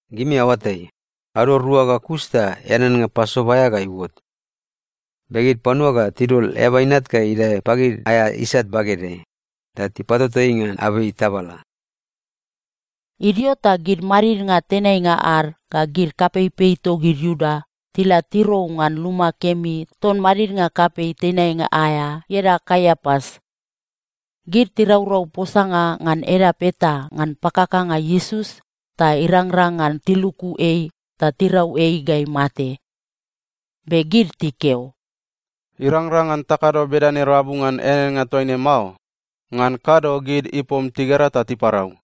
“Gimi aoatai, ado rua ga kus ta eaneannga Pasova aea ga iuot. Be gid panua ga tidol Eaba Inat ga idae pagid aea isat bagedeai, ta tipatoto ei ngan abei tabala.” Idio ta gid madidnga tenainga ad ga gid kapeipei togid Iuda tila tirou ngan luma kemi ton madidnga kapei tenainga aea ieda Kaiapas. Gid tiraurau posanga ngan edap eta ngan pakakanga Iesus ta irangrang ngan tiluku ei ta tirau ei ga imate. Be gid tikeo, “Irangrang ngan takado bedane rabu ngan eaneannga toa ne mao. Ngan kado gid ipom tigera ta tiparau.”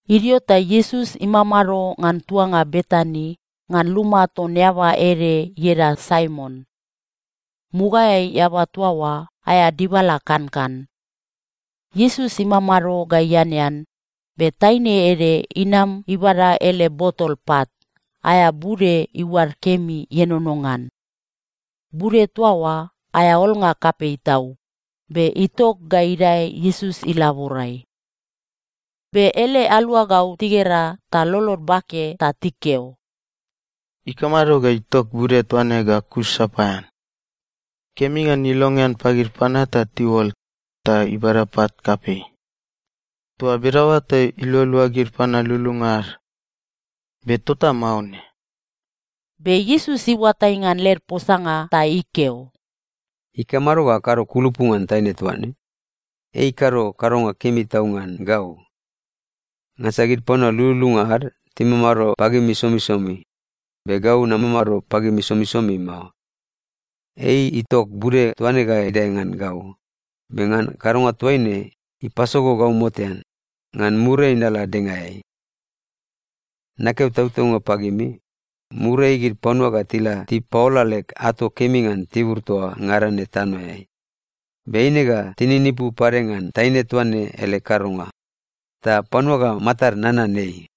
Idio ta Iesus imamado ngan tuanga Betani ngan luma ton eaba ede ieda Saimon. Mugaeai eaba toa oa aea dibala kankan. Iesus imamado ga ianean, be taine ede inam ibada ele botol pat, aea bude iuad kemi ienono ngan. Bude toa oa aea olnga kapei tau, be itok ga idae Iesus ilaborai. Be ele aluagau tigera ta lolod bake ta tikeo, “Ikamado ga itok bude toa ne ga kus sapaean? Kemi ngan ilongean pagid panua ta tiuol, ta ibada pat kapei. Toa bedaoa ta ilualua gid panua lululunga ad. Be tota mao ne.” Be Iesus iuatai ngan led posanga ta ikeo, “Ikamado ga akado kulupu ngan taine toa ne? Ei ikado kadonga kemi tau ngan gau. Ngansa gid panua lululunga ad timamado pagimi somisomi, be gau namamado pagimi somisomi mao. Ei itok bude toa ne ga idae ngan gau, be ngan kadonga toa ne ipasogo gau motean, ngan muriai nala dengaeai. Nakeo tautaunga pagimi, muriai gid panua ga tila tipaola leg ato kemi ngan tibur toa ngada ne tanoeai, be eine ga tininipu pade ngan taine toa ne ele kadonga, ta panua ga matad nanan ei.”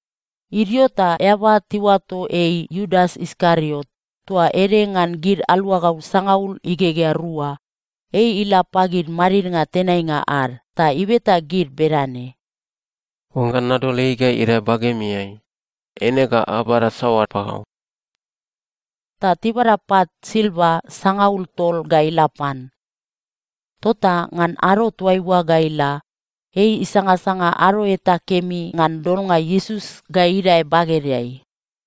Idio ta eaba tiuato ei Iudas Iskariot, toa ede ngan gid aluagau sangaul igegea rua, ei ila pagid madidnga tenainga ad ta ibeta gid bedane, “Oangga nadol ei ga idae bagemiai, eine ga abada saoa pagau?” Ta tibada pat silva sangaul tol ga ila pan. Tota ngan ado toaiua ga ila, ei isangasanga ado eta kemi ngan dolnga Iesus ga idae bagedeai.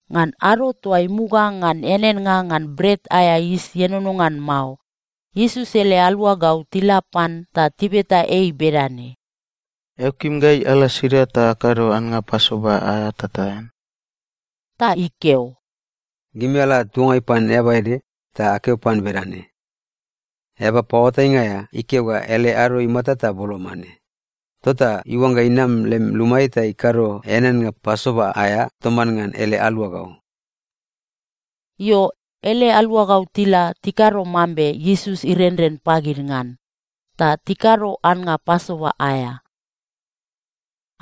Ngan ado toa imuga ngan eaneannga ngan Bret aea Yis Ienono ngan Mao, Iesus ele aluagau tila pan ta tibeta ei bedane, “Eao kim gai ala sida ta akado annga Pasova aea ta taean?” Ta ikeo, “Gimi ala tuangai pan eaba ede, ta akeo pan bedane, ‘Eaba Paoatainga aea ikeo ga ele ado imata ta boloma ne. Tota iuangga inam lem lumaeai ta ikado eaneannga Pasova aea toman ngan ele aluagau.’” Io, ele aluagau tila tikado mambe Iesus irenren pagid ngan, ta tikado annga Pasova aea.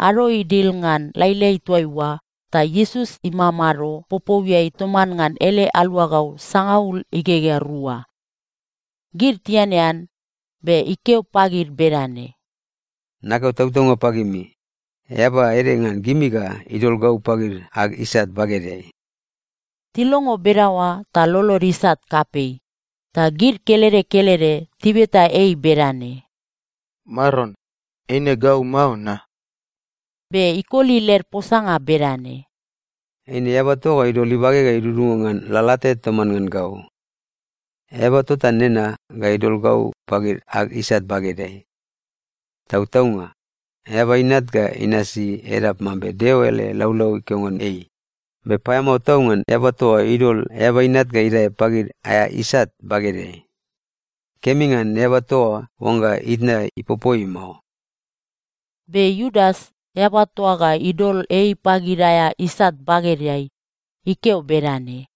Ado idil ngan lailai toaiua, ta Iesus imamado popouiai toman ngan ele aluagau sangaul igegea rua. Gid tianean, be ikeo pagid bedane, “Nakeo tautaunga pagimi, eaba ede ngan gimi ga idol gau pagid ag isat bagedeai.” Tilongo bedaoa ta lolod isat kapei, ta gid kelede kelede tibeta ei bedane, “Maron, eine gau mao, na?” Be ikoli led posanga bedane, “Eine eaba toa ga idol ibage ga idudunga ngan lalate toman ngan gau. Eaba tota nena ga idol gau pagid ag isat bagedeai. Tautaunga, Eaba Inat ga inasi edap mambe Deo ele laulau ikeo ngan ei, be paeamao tau ngan eaba toa idol Eaba Inat ga idae pagid aea isat bagedeai! Kemi ngan eaba toa oa oangga itna ipopo ei mao.” Be Iudas, eaba toa ga idol ei pagid aea isat bagedeai, ikeo bedane,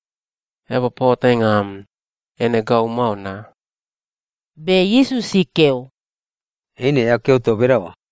“Eaba paoatainga am, eine gau mao, na?” Be Iesus ikeo, “Eine eao keo toa bedaoa.”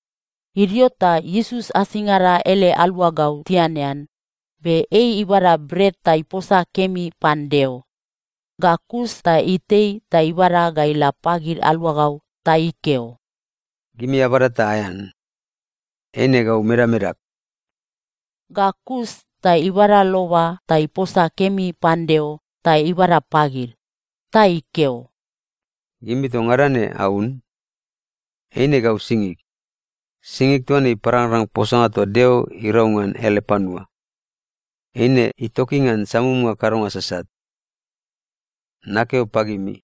Idio ta Iesus asingada ele aluagau tianean, be ei ibada bret ta iposa kemi pan Deo. Ga kus ta itei ta ibada ga ila pagid aluagau ta ikeo, “Gimi abada ta aean. Eine gau medamedag.” Ga kus ta ibada loba ta iposa kemi pan Deo ta ibada pagid. Ta ikeo, “Gimi toa ngada ne aun. Eine gau singig. Singig toa ne iparangrang posanga toa Deo irau ngan ele panua. Eine itoki ngan samumnga kadonga sasat. Nakeo pagimi,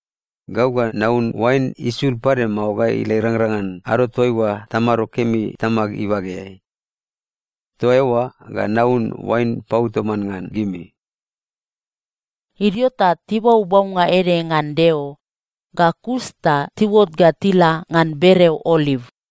gau ga naun oain isul pade mao ga ila irangrang ngan ado toaiua tamado kemi Tamag ibageai. Toa eoa ga naun oain pau toman ngan gimi.” Idio ta tibau baunga ede ngan Deo, ga kus ta tiuot ga tila ngan bereo Oliv.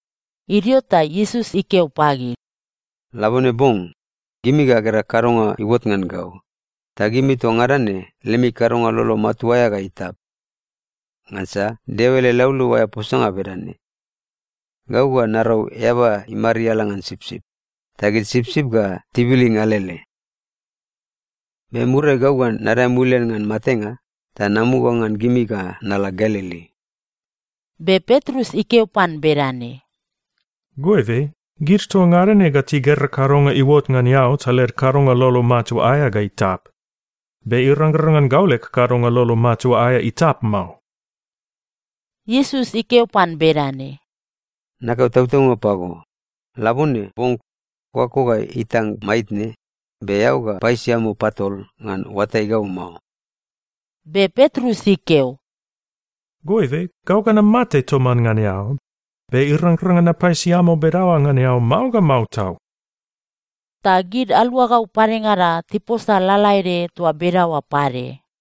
Idio ta Iesus ikeo pagid, “Labone bong, gimi ga agera kadonga iuot ngan gau, ta gimi toa ngada ne lemi kadonga lolo matua aea ga itap. Ngansa Deo ele laulau aea posanga bedane, “‘Gau ga narau eaba imariala ngan sipsip, ta gid sipsip ga tibilin alele.’ Be muriai gau ga nadae mulian ngan matenga ta namuga ngan gimi ga nala Galili.” Be Petrus ikeo pan bedane, “Goibe, gid toa ngada ne ga tigera kadonga iuot ngan eao ta led kadonga lolo matua aea ga itap, be irangrang ngan gau leg kadonga lolo matua aea itap mao.” Iesus ikeo pan bedane, “Nakeo tautaunga pago, labone bong kokako ga itang maitne, be eao ga paisiamo patol ngan oatai gau mao.” Be Petrus ikeo, “Goibe, gau ga namate toman ngan eao, be irangrang ngan napaisiamo bedaoa ngan eao mao ga mao tau.” Ta gid aluagau padengada tiposa lalaede toa bedaoa pade.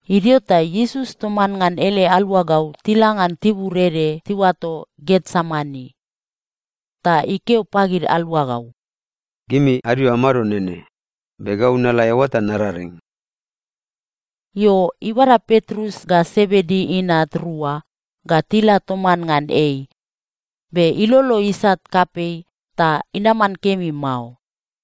Idio ta Iesus toman ngan ele aluagau tila ngan tibur ede tiuato Getsemani. Ta ikeo pagid aluagau, “Gimi adio amado nene, be gau nala eoa ta nararing.” Io, ibada Petrus ga Sebedi inat rua ga tila toman ngan ei, be ilolo isat kapei ta inaman kemi mao.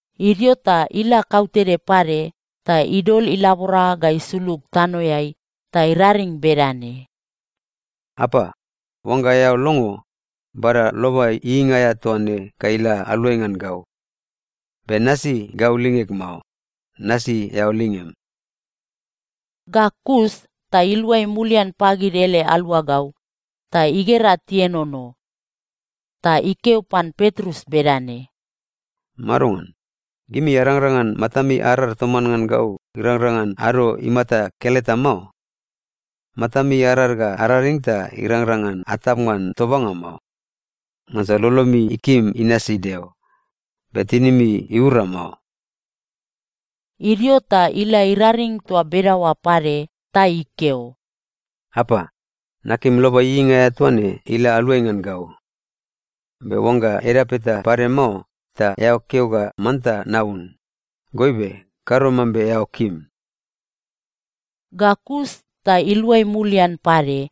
Idio ta ila kautede pade ta idol ilabora ga isulug tanoeai ta iraring bedane, “Apa, oangga eao longo, bada loba ieieinga aea toa ne ga ila aluai ngan gau. Be nasi gau lingeg mao, nasi eao lingem.” Ga kus ta iluai mulian pagid ele aluagau, ta igera tienono. Ta ikeo pan Petrus bedane, “Madongan? Gimi arangrang ngan matami arar toman ngan gau irangrang ngan ado imata keleta mao? Matami arar ga araring ta irangrang ngan atap ngan tobanga mao. Ngansa lolomi ikim inasi Deo, be tinimi iura mao.” Idio ta ila iraring toa bedaoa pade ta ikeo, “Apa, nakim loba ieieinga aea toa ne ila aluai ngan gau. Be oangga edap eta pade mao, ta eao keo ga manta naun, goibe kado mambe eao kim.” Ga kus ta iluai mulian pade,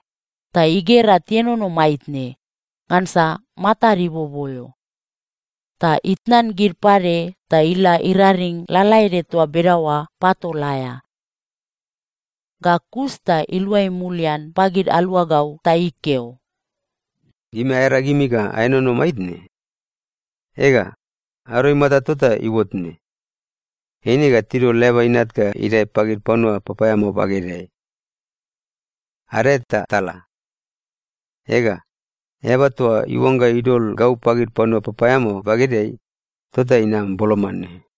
ta igera tienono maitne, ngansa matad iboboeo. Ta itnan gid pade ta ila iraring lalaede toa bedaoa patol aea. Ga kus ta iluai mulian pagid aluagau ta ikeo, “Gimi aearagimi ga aenono maitne? Ega, ado imata tota iuot ne. Eine ga tidol Eaba Inat ga idae pagid panua papaeamao bagedeai. Adae ta tala. Ega, eaba toa iuangga idol gau pagid panua papaeamao bagedeai, tota inam boloma ne.”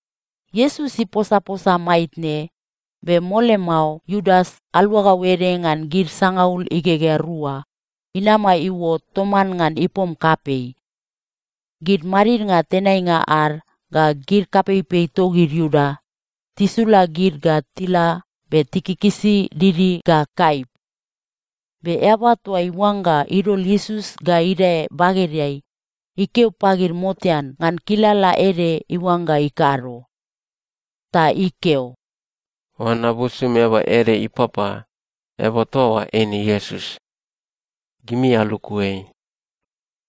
Iesus iposaposa maitne, be mole mao Iudas, aluagau ede ngan gid sangaul igegea rua, inama iuot toman ngan ipom kapei. Gid madidnga tenainga ad ga gid kapeipei togid Iuda tisula gid ga tila be tikikisi didi ga kaip. Be eaba toa iuangga idol Iesus ga idae bagedeai, ikeo pagid motean ngan kilala ede iuangga ikado. Ta ikeo, “Oangga nabusum eaba ede ipapa, eaba toa oa eine Iesus. Gimi aluku ei.”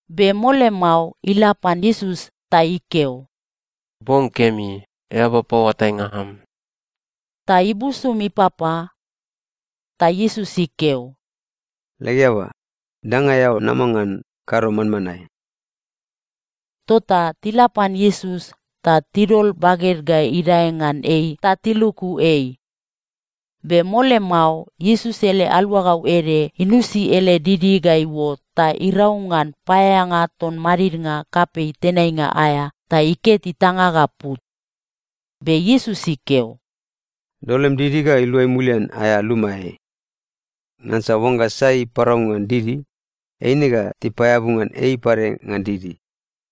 Be mole mao ila pan Iesus ta ikeo, “Bong kemi, eaba paoatainga am.” Ta ibusum ipapa. Ta Iesus ikeo, “Leg eaba, danga eao nama ngan, kado manmanae.” Tota tila pan Iesus ta tidol baged ga idae ngan ei ta tiluku ei. Be mole mao, Iesus ele aluagau ede inusi ele didi ga iuot ta irau ngan paeaeanga ton madidnga kapei tenainga aea ta iket itanga ga put. Be Iesus ikeo, “Dol lem didi ga iluai mulian aea lumaeai! Ngansa oangga sai iparau ngan didi, eine ga tipaeabu ngan ei pade ngan didi.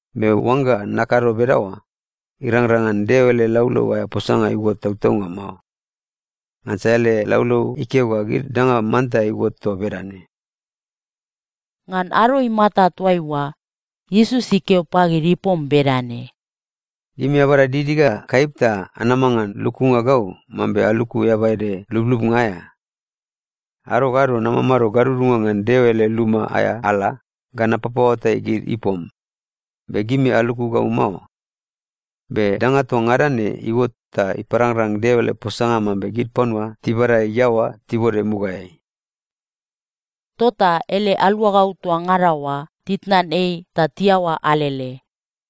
Be oangga nakado bedaoa, irangrang ngan Deo ele laulau aea posanga iuot tautaunga mao. Ngansa ele laulau ikeo ga gid danga manta iuot toa bedane.” Ngan ado imata toaiua, Iesus ikeo pagid ipom bedane, “Gimi abada didi ga kaip ta anama ngan lukunga gau mambe aluku eaba ede lublubnga aea? Ado ga ado namamado gadudunga ngan Deo ele luma aea ala ga napapaoatai gid ipom, be gimi aluku gau mao. Be danga toa ngada ne iuot ta iparangrang Deo ele posanga mambe gid panua tibada iaoa tibode mugaeai.” Tota ele aluagau toa ngada oa titnan ei ta tiaoa alele.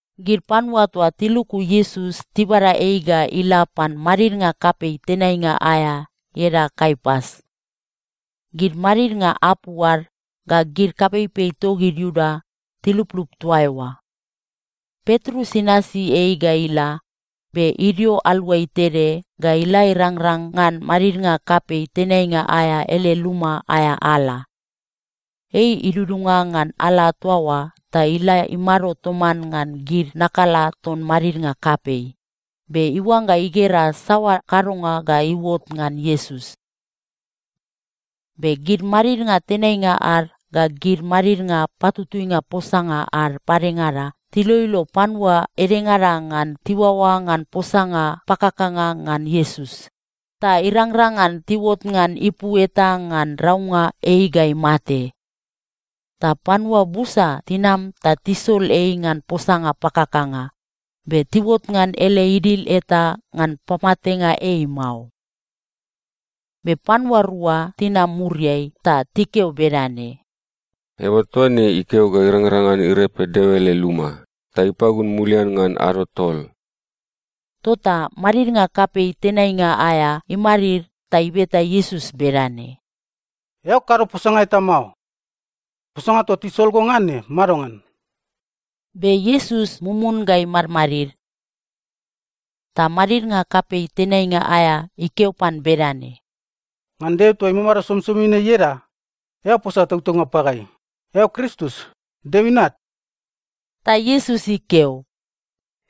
Gid panua toa tiluku Iesus tibada ei ga ila pan madidnga kapei tenainga aea ieda Kaiapas. Gid madidnga apu ad ga gid kapeipei togid Iuda tiluplup toa eoa. Petrus inasi ei ga ila, be idio aluai tede ga ila irangrang ngan madidnga kapei tenainga aea ele luma aea ala. Ei idudunga ngan ala toa oa ta ila imado toman ngan gid nakala ton madidnga kapei, be iuangga igera saoa kadonga ga iuot ngan Iesus. Be gid madidnga tenainga ad ga gid madidnga patutuinga posanga ad padengada tiloilo panua edengada ngan tiuaoa ngan posanga pakakanga ngan Iesus, ta irangrang ngan tiuot ngan ipu eta ngan raunga ei ga imate. Ta panua busa tinam ta tisol ei ngan posanga pakakanga, be tiuot ngan ele idil eta ngan pamatenga ei mao. Be panua rua tinam muriai ta tikeo bedane, “Eaba toa ne ikeo ga irangrang ngan irepe Deo ele luma, ta ipagun mulian ngan ado tol.” Tota madidnga kapei tenainga aea imadid ta ibeta Iesus bedane, “Eao kado posanga eta mao? Posanga toa tisol go ngan ne madongan?” Be Iesus mumun ga imadmadid. Ta madidnga kapei tenainga aea ikeo pan bedane, “Ngan Deo toa imamado somisomi ne ieda, eao posa tautaunga pagai, eao Kristus, Deo Inat?” Ta Iesus ikeo,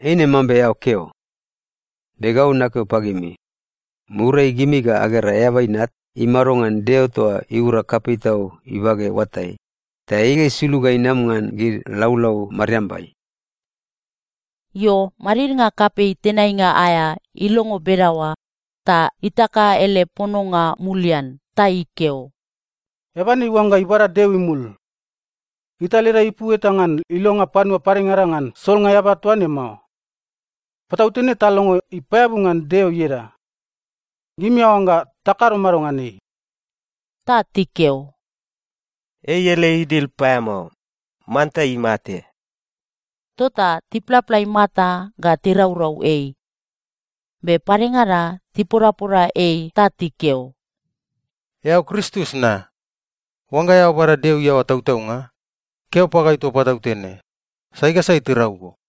“Eine mambe eao keo. Be gau nakeo pagimi, muriai gimi ga agera Eaba Inat imado ngan Deo toa iura kapei tau ibage oatai, ta ei ga isulug ga inam ngan gid laulau mariambai.” Io, madidnga kapei tenainga aea ilongo bedaoa ta itaka ele pononga mulian ta ikeo, “Eaba ne iuangga ibada Deo imul! Gita leda ipu eta ngan ilonga panua padengada ngan solnga eaba toa ne mao. Patautene talongo ipaeabu ngan Deo ieda. Gimi aoangga takado mado ngan ei?” Ta tikeo, “Ei ele idil paeamao. Manta imate.” Tota tiplapla imata ga tiraurau ei. Be padengada tipodapoda ei ta tikeo, “Eao Kristus na? Oangga eao bada Deo iaoa tautaunga, keo pagai toa patautene, sai ga sai tirau go?”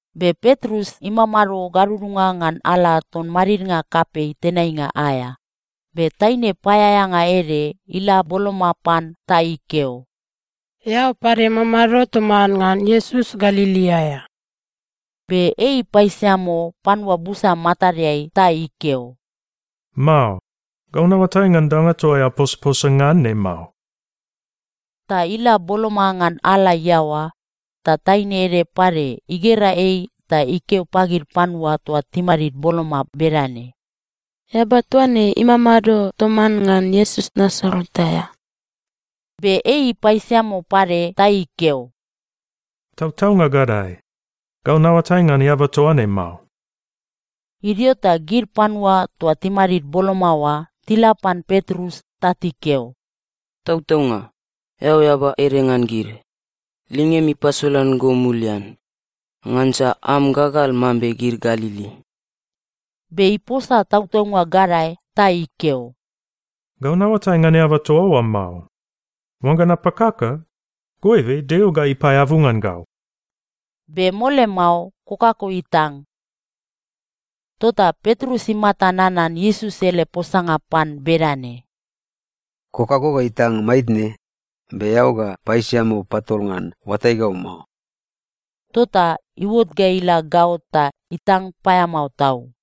Be Petrus imamado gadudunga ngan ala ton madidnga kapei tenainga aea, be taine paeaeanga ede ila boloma pan ta ikeo, “Eao pade mamado toman ngan Iesus Galili aea.” Be ei ipaisiamo panua busa matadeai ta ikeo, “Mao. Gau naoatai ngan danga toa eao posaposa ngan ne mao.” Ta ila boloma ngan ala iaoa, ta taine ede pade igera ei ta ikeo pagid panua toa timadid boloma bedane, “Eaba toa ne imamado toman ngan Iesus Nasaret aea.” Be ei ipaisiamo pade ta ikeo, “Tautaunga gadae, gau naoatai ngan eaba toa ne mao.” Idio ta gid panua toa timadid boloma oa tila pan Petrus ta tikeo, “Tautaunga, eao eaba ede ngan gid. Lingem ipasolan go mulian. Ngansa am gagal mambe gid Galili.” Be iposa tautaunga gadae ta ikeo, “Gau naoatai ngan eaba toa oa mao. Oangga napakaka, goibe Deo ga ipaeabu ngan gau.” Be mole mao kokako itang. Tota Petrus imata nanan Iesus ele posanga pan bedane, “Kokako ga itang maitne, be eao ga paisiamo patol ngan oatai gau mao.” Tota iuot ga ila gaot ta itang paeamao tau.